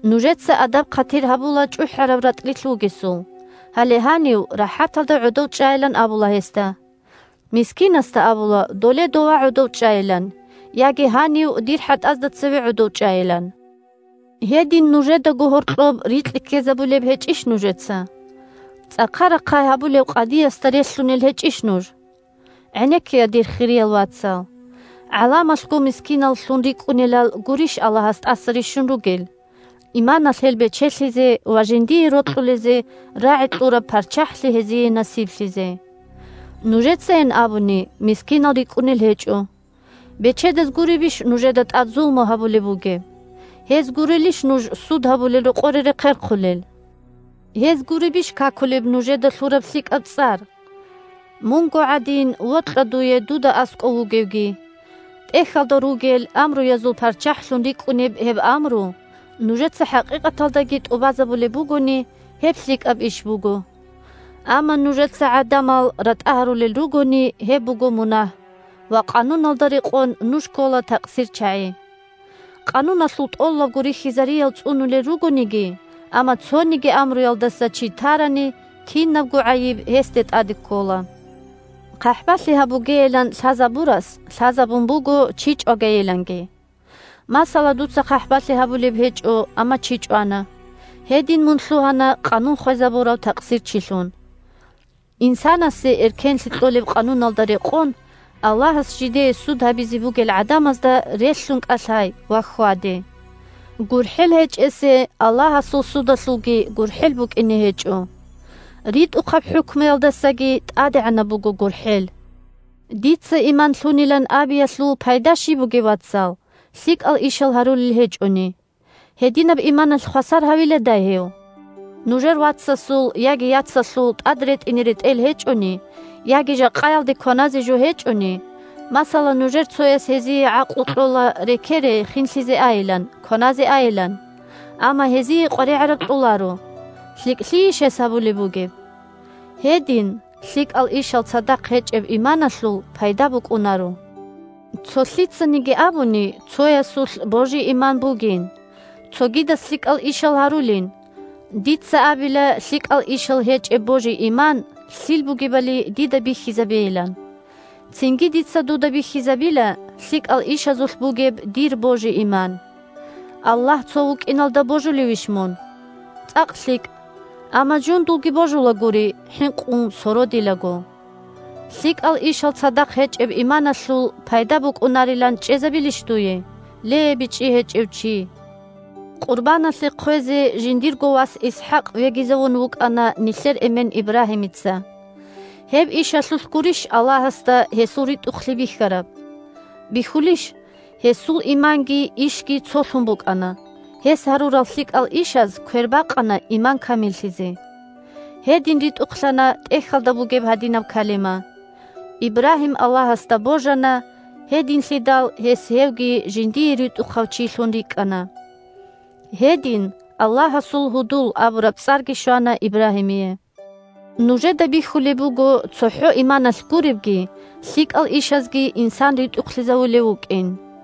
Нужеца адаб-хъатир гьабула чӀухӀараб ратӀлилъ вугесул, гьале гьанив рахӀаталда гӀодов чӀайилан абула гьесда. Мискинасда абула доле дова гӀодов чӀайилан яги гьанив дир хӀатӀазда цеве гӀодов чӀайилан. Гьедин нужедаго гьоркьоб рикьи ккезабулеб гьечӀищ нужеца? ЦӀахъа-рахъай гьабулев къадиясда релълъунел гьечӀищ нуж? ГӀенеккея, дир хириял вацал! ГӀаламалъго мискиналлъун рикӀкӀунелал гурищ Аллагьас тӀаса рищун ругел, иманалъ гьел бечелъизе ва жиндие рокьулезе рагӀи кьураб ПарччахӀлъи гьезие насиблъизе? Нужецайин абуни мискинал рикӀкӀунел гьечӀо! Бечедаз гуребищ нужеда тӀад зулму гьабулеб бугеб? Гьез гурелищ нуж суд гьабулел рокъоре рехъерхъулел? Гьез гуребищ какулеб нужеда лъураб лъикӀаб цӀар? «Мунго гӀадин вокьа дуе дуда аскӀов вугевги», – ТӀехьалда ругел амруязул парччахӀлъун рикӀкӀунеб гьеб амру нужеца хӀакъикъаталдаги тӀубазабулеб бугони, гьеб лъикӀаб иш буго. Амма нужеца гӀадамал ратӀа гьарулел ругони, гьеб буго мунагь, ва, Къануналда рекъон, нуж ккола такъсирчагӀи. Къануналъул тӀолалго рихьизариял цӀунулел ругониги, амма цониги амруялдаса чи тарани, кинабго гӀайиб гьесде тӀаде ккола. ХъахӀбалъи гьабугейилан лъазабурас лъазабун буго чи чӀвагейиланги. Масала, дуца хъахӀбалъи гьабулеб гьечӀо, амма чи чӀвана, гьедин мун лъугьана къанун хвезабурав такъсирчилъун. Инсанасе эркенлъи кьолеб къануналда рекъон Аллагьас жидее суд гьабизе бугел гӀадамазда релълъун кӀалъай ва хьваде. ГурхӀел гьечӀесе Аллагьасул судалъулги гурхӀел букӀине гьечӀо. РитӀухъаб хӀукмуялдасаги тӀадегӀанаб буго гурхӀел! Дица иман лъунилан абиялъул пайда щиб бугеб, вацал, лъикӀал ишал гьарулел гьечӀони? Гьединаб иманалъ хвасар гьавиладай гьев? Нужер вацасул яги яцалъул тӀад ретӀине ретӀел гьечӀони, яги жакъаялде кваназе жо гьечӀони, масала, нужер цояс гьезие гӀакълу кьола, рекере, хинлъизе айилан, кваназе айилан, амма гьезие къваригӀараб кьоларо, – лъикӀлъийищ гьес гьабулеб бугеб? Гьедин, лъикӀал ишал цадахъ гьечӀеб иманалъул пайда букӀунаро. Цо лъицаниги абуни, цоясулъ божи-иман бугин, цогидас лъикӀал ишал гьарулин, – дица абила лъикӀал ишал гьечӀеб божи-иман лъил бугебали дида бихьизабейилан; цинги дица дуда бихьизабила лъикӀал ишазулъ бугеб дир божи-иман. Аллагь цо вукӀиналда божулевищ мун? ЦӀакъ лъикӀ! Амма жундулги божулагури хӀинкъун сородилаго! ЛъикӀал ишал цадахъ гьечӀеб иманалъул пайда букӀунарилан чӀезабилищ дуе, ле, бичӀчӀи гьечӀев чи? Къурбаналъе хъвезе жиндирго вас ИсхӀакъ вегизавун вукӀана нилъер эмен Ибрагьимица. Гьеб ишалъулъ гурищ Аллагьасда гьесул ритӀухълъи бихьараб? Бихьулищ – гьесул иманги ишги цолъун букӀана, гьес гьарурал лъикӀал ишаз квербакъана иман камиллъизе. Гьедин ритӀухълъана ТӀехьалда бугеб гьадинаб калима: «Ибрагьим Аллагьасда божана, гьединлъидал гьес гьевги жиндие ритӀухъав чилъун рикӀкӀана». Гьедин «Аллагьасул гьудул» абураб цӀарги щвана Ибрагьимие. Нужеда бихьулеб буго цохӀо иманалъ гуребги, лъикӀал ишазги инсан ритӀухълъизавулев вукӀин.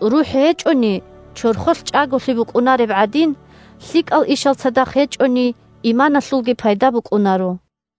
РухӀ гьечӀони, чорхолъ чӀаголъи букӀунареб гӀадин, лъикӀал ишал цадахъ гьечӀони, иманалъулги пайда букӀунаро.